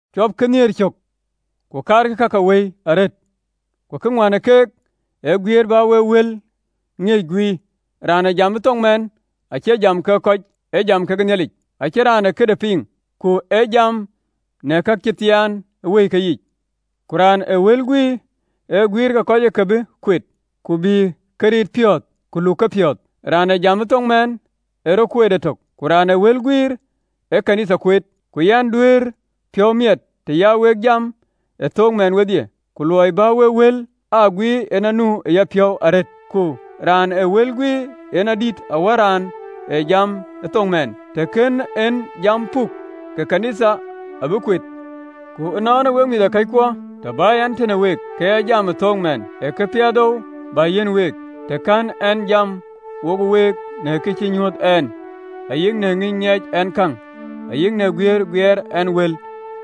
Cuɔpkï nhiëër cök, ku kaarkï ka ke Wëi arëët, ku kë ŋuän ë keek ee guiëër bä wek wël ŋiëc guiir. Raan ee jam ë thoŋ mɛɛn acie jam ke kɔc, ee jam ke Nhialic, acïn raan ee këde piŋ, ku ee jam në kacïmoony ë wëike yiic. Ku raan ee wël guiir ee guïïr ke kɔc ë ke bï kueet, ku bï ke riit piɔ̈ɔ̈th, ku luk ke piɔ̈ɔ̈th. Raan ee jam ë thoŋ mɛɛn ee rɔt kueet etök, ku raan ee wël guiir ee ɣön ë Nhialic kueet. Ku yɛn duëër piɔ̈u miɛt të ya wek jam ë thook mɛɛn wedhie, ku luɔi bä wek wël aa guiir yen anu ë yapiɔ̈u arëët. Ku raan ee wël guiir yen adït awär raan ee jam ee thook mɛɛn, të kën en jam puk, ke ɣön ë Nhialic ë bï kueet. Ku ënɔɔnë, wek mïthëkɔckuɔ, të bä yɛn tëde week, ke ya jam ë thook mɛɛn, ee këpiɛthou bä yiɛ̈n week, të kɛ̈n ɛn jam wo week në kë cï nyuöth ɛn, ayï në ŋïny ŋiɛc ɛn käŋ, ayï në guiëër guiëër ɛn wël,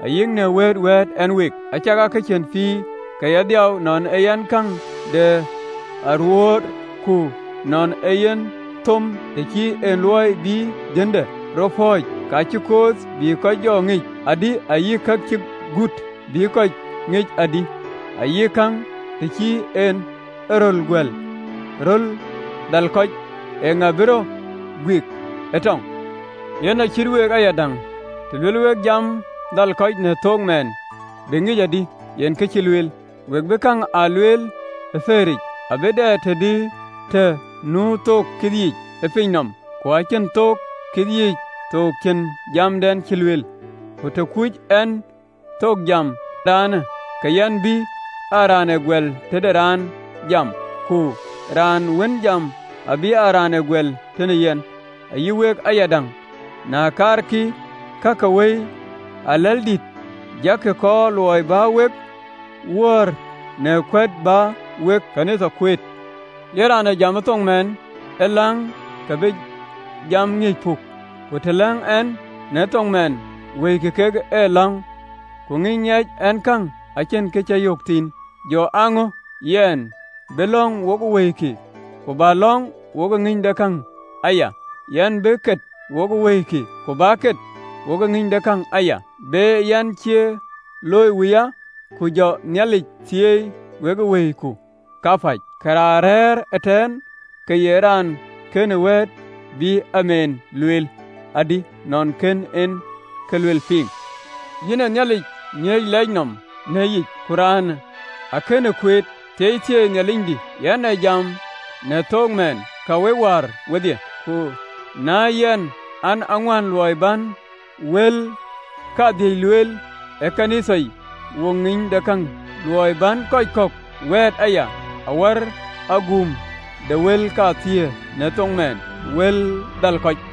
ayï në wëët wɛ̈ɛ̈t ɛn week? Acakaa ka cïn pïïr, ka ye dhiau, nɔn ee yen kaaŋ de aruöör, ku nɔn ee yen thom, të cïn en luɔi bï dhiënde rɔt pɔ̈ɔ̈c, kë cï kooth bï jɔ ŋic adï, ayï kë cï gut, bï kɔc ŋic adï? Ayï kaaŋ, të cï en e röl guɛ̈l, röl dhal kɔc, eeŋa bï rɔt guik ë tɔŋ? Yen acït week ayadäŋ, të luɛɛl wek jam dhal kɔc në thoŋ mɛɛn, bï ŋic adï yen kë cï lueel? We bï käŋ aa lueel ë pëëric! Abï dɛ të nu thook kith yiic ë piny nɔm, ku acïn thok ë keyiic thoŋ cïn jamden cï lueel. Ku të kuöc ɛn thoŋ jiɛɛmë raanë, ke yɛn bï aa raan ë guɛl tëde raan jam, ku raan wën jam abï aa raan ë guɛl tëde yɛn. Ayï week ayadäŋ, na kaarkï ka ke Wëi aläldïïtë, jakï kɔɔr luɔi bä wek wöör në kuɛ̈t bä wek ɣön ë Nhialic kueet. Yen raan ee jam ë thoŋ mɛɛn ë läŋ ke bï jam ŋiëc puk. Ku të läŋ ɛn në thoŋ mɛɛn, wëikï kek aläŋ, ku ŋïny ŋiɛc ɛn käŋ acïn kë cï yök thïn. Jɔ aa ŋö? Yɛn bï lɔ̈ŋ wokë wëikï, ku bä lɔ̈ŋ wokë ŋïnydekäŋ aya: yɛn bï kët wokë wëikï, ku bä kët wokë ŋïnydekäŋ aya. Be an, cie looi wuya, ku jɔ Nhialic thieei wekë wëiku kapäc, ke raan rɛ̈ɛ̈r ëtɛ̈ɛ̈n ke ye raan kënë wɛ̈ɛ̈t, bï “Amiin” lueel adï, nɔn kën en kë luel piŋ? Yïn ë Nhialic ŋiëc leec nɔm në yic, ku raanë akënë kueet. Thieithieei Nhialicdï, yɛn ee jam në thook mɛɛn, ka week wäär wedhie. Ku në yɛn an, aŋuän luɔi bän wël kadhïc lueel ɣön ë Nhialic wokë ŋïnydekäŋ, luɔi bän kɔc kɔ̈k wɛ̈ɛ̈t aya, awär aguum ke wël kathiëër në thoŋ mɛɛn, në wël dhal kɔc.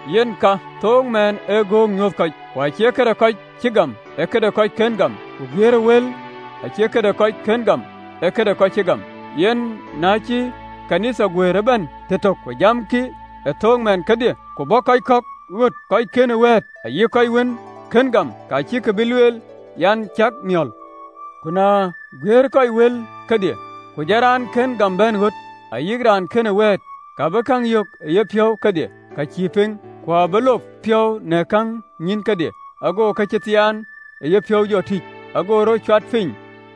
Yen ka, thook mɛɛn ee gök nyuuth kɔc, ku acie këde kɔc cï gam, ee këde kɔc kën gam, ku guiëërë wël acie këde kɔc kën gam, ee këde kɔc cï gam. Yen na cï ɣön ë Nhialic guëër ëbɛ̈n tëtök, ku jamkï ë thook mɛɛn kedhie, ku bɔ̈ kɔc kɔ̈k ɣöt kɔc kënë wɛ̈ɛ̈t, ayï kɔc wën kën gam, ke cïkï bï lueel an, cäk miɔ̈l? Ku na guiir kɔc wël kedhie, ku jɔ raan kën gam bɛ̈n ɣöt, ayï raan kënë wɛ̈ɛ̈t, ka bï käŋ yök ë yepiɔ̈u kedhie, ka cï piŋ, ku abï luɔp piɔ̈u në käŋ nyïïn kedhie. Ago ka cï thiaan ë yepiɔ̈u jɔ tïc, ago rɔt cuat piny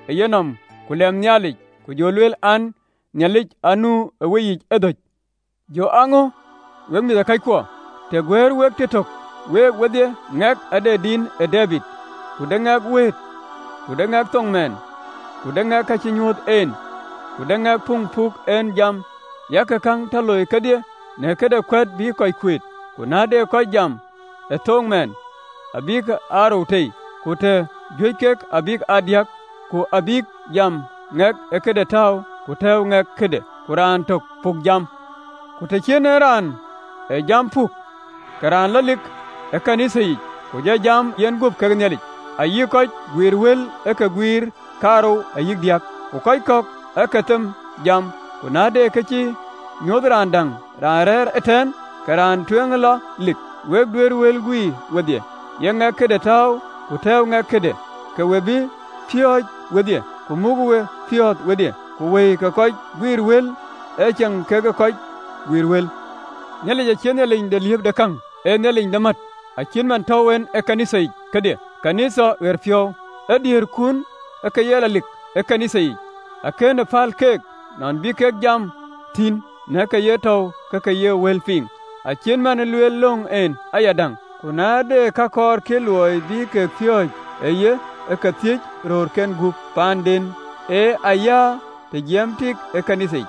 ë yenɔm, ku lɛm Nhialic, ku jɔ lueel an, “Nhialic anu ë weyiic ëdhöc!” Jɔ aa ŋö, wek mïthëkɔckuɔ? Të guɛ̈ɛ̈r wek tëtök, week wedhie, ŋɛk ade din ë Debid, ku de ŋɛk wëët, ku de ŋɛk thoŋ mɛɛn, ku de ŋɛk kë cï nyuöth en, ku de ŋɛk puŋ puk en jam. Yak käŋ tɔ loi kedhie në këde kuɛ̈t bï kɔc kuet. Ku na de kɔc jam ë thoŋ mɛɛn, abïk aa rou tei, ku të juëc kek, abïk aa diäk, ku abïk jam, ŋɛk ë këde tääu, ku tɛ̈ɛ̈u ŋɛk këde, ku raan tök abï jam pukic. Ku të cïn en raan ee jam pukic, ke raan lɔ lik ɣön ë Nhialic, ku jɔ jam yenguöp kekë Nhialic. Ayï kɔc guiir wël ë ke guïïr kaarou ayï diäk, ku kɔc kɔ̈k ë ke them jam luelkï. Ku na de kë cï nyuöth raan däŋ raan rɛ̈ɛ̈r ëtɛ̈ɛ̈n, ke raan tueŋ lɔ lik. Wek duëër wël guiir wedhie, ye ŋɛk këde tääu, ku tɛ̈ɛ̈u ŋɛk këde, ke we bï piööc wedhie, ku muk we piɔ̈ɔ̈th wedhie. Ku wëi ke kɔc guiir wël aceŋ keek ë kɔc guiir wël. Nhialic acie Nhialic de liëëpëkäŋ, ee Nhialic de mät. Cït man tɔ̈u en në ɣööt ke Nhialic yiic kedhie, ɣööt de kɔc cï gam. Ë diëërkun ë ke ye lɔ lik ë ɣööt ke Nhialic yiic: akënë päl keek nɔn bï kek jam thïn, në ke ye tɔ̈u ke ke ye wël piŋ, acït man lueelë löŋ en ayadäŋ. Ku na de kë kɔɔrkï luɔi bï ke piööc ë ye, ë ke thiëc röörken gup paanden, ee ayäär të jiɛɛmë tik ɣön ë Nhialic yic.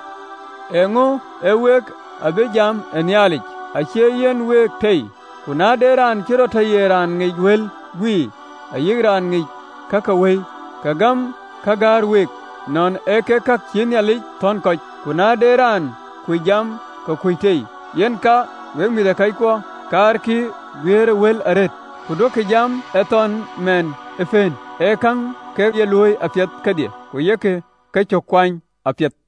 Eeŋö? Ee week ë bïï jam ë Nhialic? Ë cïï yïnë week tei? Ku na de raan cï rɔt tɔ ye tiët ee wël guiir, ayï raan ŋic ka ke Wëi, ke gam ka gäär week, nɔn ee kek ka cïï Nhialic thɔ̈n kɔc. Ku na de raan kuc jam, ke kuc tei. Yen ka, wek mïthëkɔckuɔ, kaarkï guiëërëwël arëët, ku duökï jam ë thoŋ mɛɛn ee pëën. Ë käŋ ë ke ye looi apiɛth kedhie, ku yek kecök kuany apiɛth.